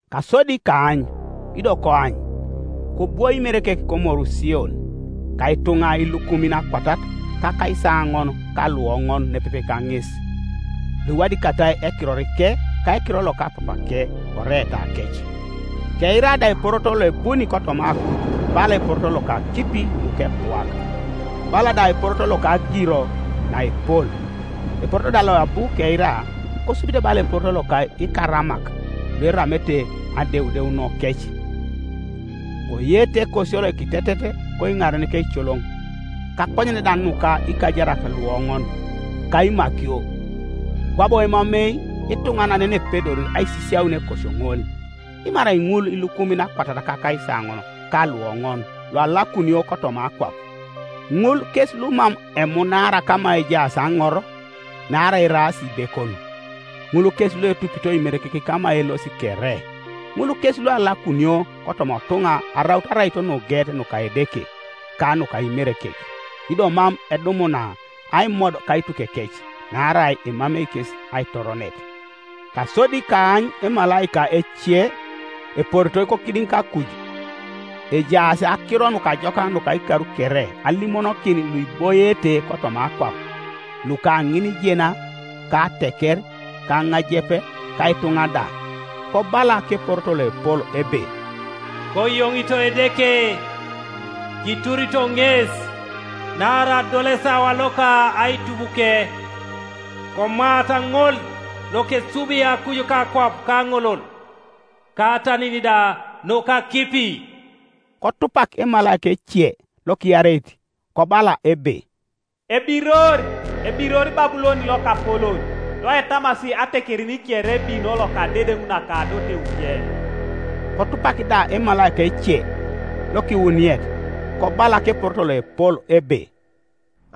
Kasodi kaany, ido koany, kobwoi Imerekek komoru Sion, ka ituŋa ilukumin akwatat ka akaisaoŋon ka luoŋon nepepe kaŋes, luiwadikatai ekirorike, ka ekiror loka Papake oreetakec. Keira da eporoto loebuni kotoma akuj bala eporoto loka akipi nukepuak, bala da eporoto loka agiro naepol; eporoto da loabu keira kosubite bala eporoto loka ikaramak lueramete adeudeunokec. Koyeete ekosio lokitetet koiŋaren keicoloŋ, kakonyen da nuka ikajarak luoŋon, ka imakio. Kwabo emamei ituŋanan yenepedori aisisiaun ekosio ŋol, dimarai ŋul ilukumin akwatat ka akaisaoŋon ka luoŋon, lualakunio kotoma akwap. Ŋul kes lumam emunaara kama ejaas aŋor naarai eraas ibekon; ŋul kes luetupito Imerekek kama elosi kere; ŋul kes lualakunio kotoma otuŋa araut araito nugeet nuka Edeke, ka nuka Imerekek, ido mam edumuna aimod kaitukekec, naarai emamei kes aitoronet. Kasodi kaany emalaika ece eporitoi kokidiŋ kakuj, ejaas Akiro Nukajokak nuka ikar kere alimonokin luiboiete kotoma akwap, luka ŋinijena, ka ateker, ka aŋajep, ka ituŋa da; kobala keporoto loepol ebe, “Koyoŋito Edeke, kiturito ŋes, naarai adol esawa loka aitubuke, komaata ŋol lokesubi akuj; ka akwap ka aŋolol, ka atanin da nuka akipi.” Kotupak emalaika ece, lokiareit, kobala ebe, “Ebiror, ebiror Babulon lokapolon, loetamasi atekerin kere ebino loka adedeŋ naka adoteuke.” Kotupak da emalaika ece, lokiwuniet, kobala keporoto loepol ebe,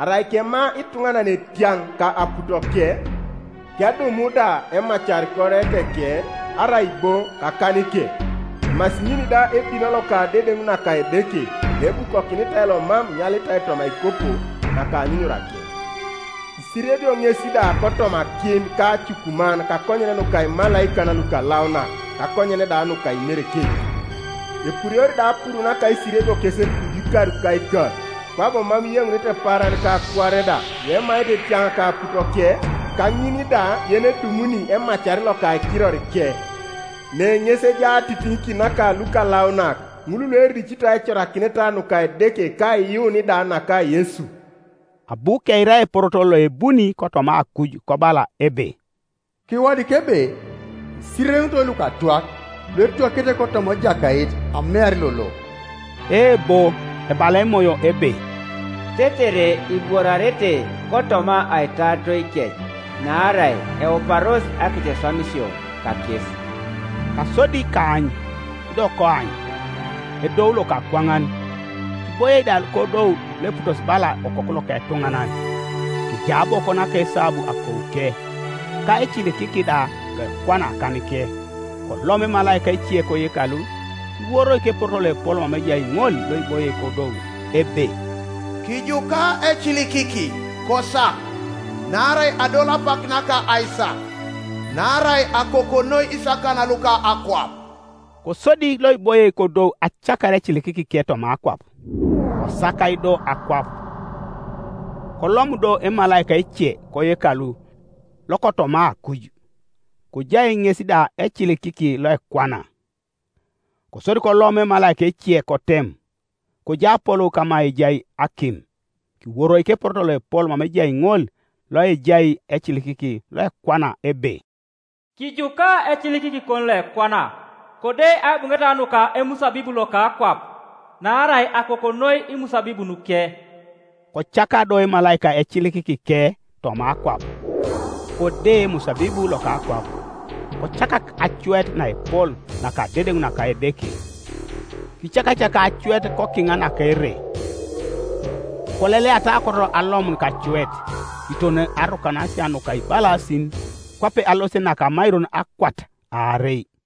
“Arai kema ituŋanan etiaŋ ka aputoke, kedumu da emacar koreeteke arai bo kakanike, emasi ŋin da ebino loka adedeŋ naka Edeke, loebukokinitai lomam inyalitai toma aikopo naka anyunyurake, isiriebio ŋes da kotoma akim ka acukuman kakonyen nuka imalaikan lukalaunak, kakonyen da nuka Imerekek. Epuriori da apuru naka aisiriebiokec kuju, ikar ka ikar, kwabo mam iyeŋunete paaran ka kuare da, luemaete etiaŋ ka aputoke, ka ŋin da yenedumuni emacar loka ekirorike.” Ne ŋes ejai atitiŋikin naka lukalaunak, ŋul luericito aicorakineta nuka Edeke ka aiyuun da naka Yesu. Abu keira eporoto loebuni kotoma akuj kobala ebe, “Kiwadik ebe: Isirereŋitoi lukatwak, luetwakete kotoma Ejakait amear lolo.” Eebo, ebala Emoyo ebe, “Tetere ibworarete kotoma aitaaritoikec; naarai euparos akeceswamisio kakes!” Kasodi kaany, ido koany, edou lokakwaŋan, kiboie da kodou loeputosi bala okoku loka etuŋanan, kejai aboko naka esabu akouke, ka ecilikiki da loekwana akanike. Kolomu emalaika ece koyekalu, kiworoi keporoto loepol mama ejai ŋol loiboie kodou, ebe, “Kijuka ecilikiki, kosak, naarai adol apak naka aisak, naarai akoko noi isakan luka akwap.” Kosodi loiboie kodou acakar ecilikikike toma akwap, kosakai do akwap. Kolomu do emalaika ece koyekalu lokotoma akuj, kojai ŋes da ecilikiki loekwana. Kosodi kolom emalaika ece kotem, kojai apolou kama ejai akim, kiworoi keporoto loepol mama ejai ŋol loejai ecilikiki loekwana, ebe, “Kijuka ecilikikikon loekwana, kode aibuŋeta nuka emusabibu loka akwap, naarai akoko noi imusabibunuke.” Kocaka do emalaika ecilikikike toma akwap, kode emusabibu loka akwap, kocakak acuet naepol naka adedeŋ naka Edeke. Kicakacakai acuet kokiŋa naka ere, koleleata aokot alomun kacuet, kiton arukanasia nuka ibalasin, kwape alosit naka amairon akwat aarei.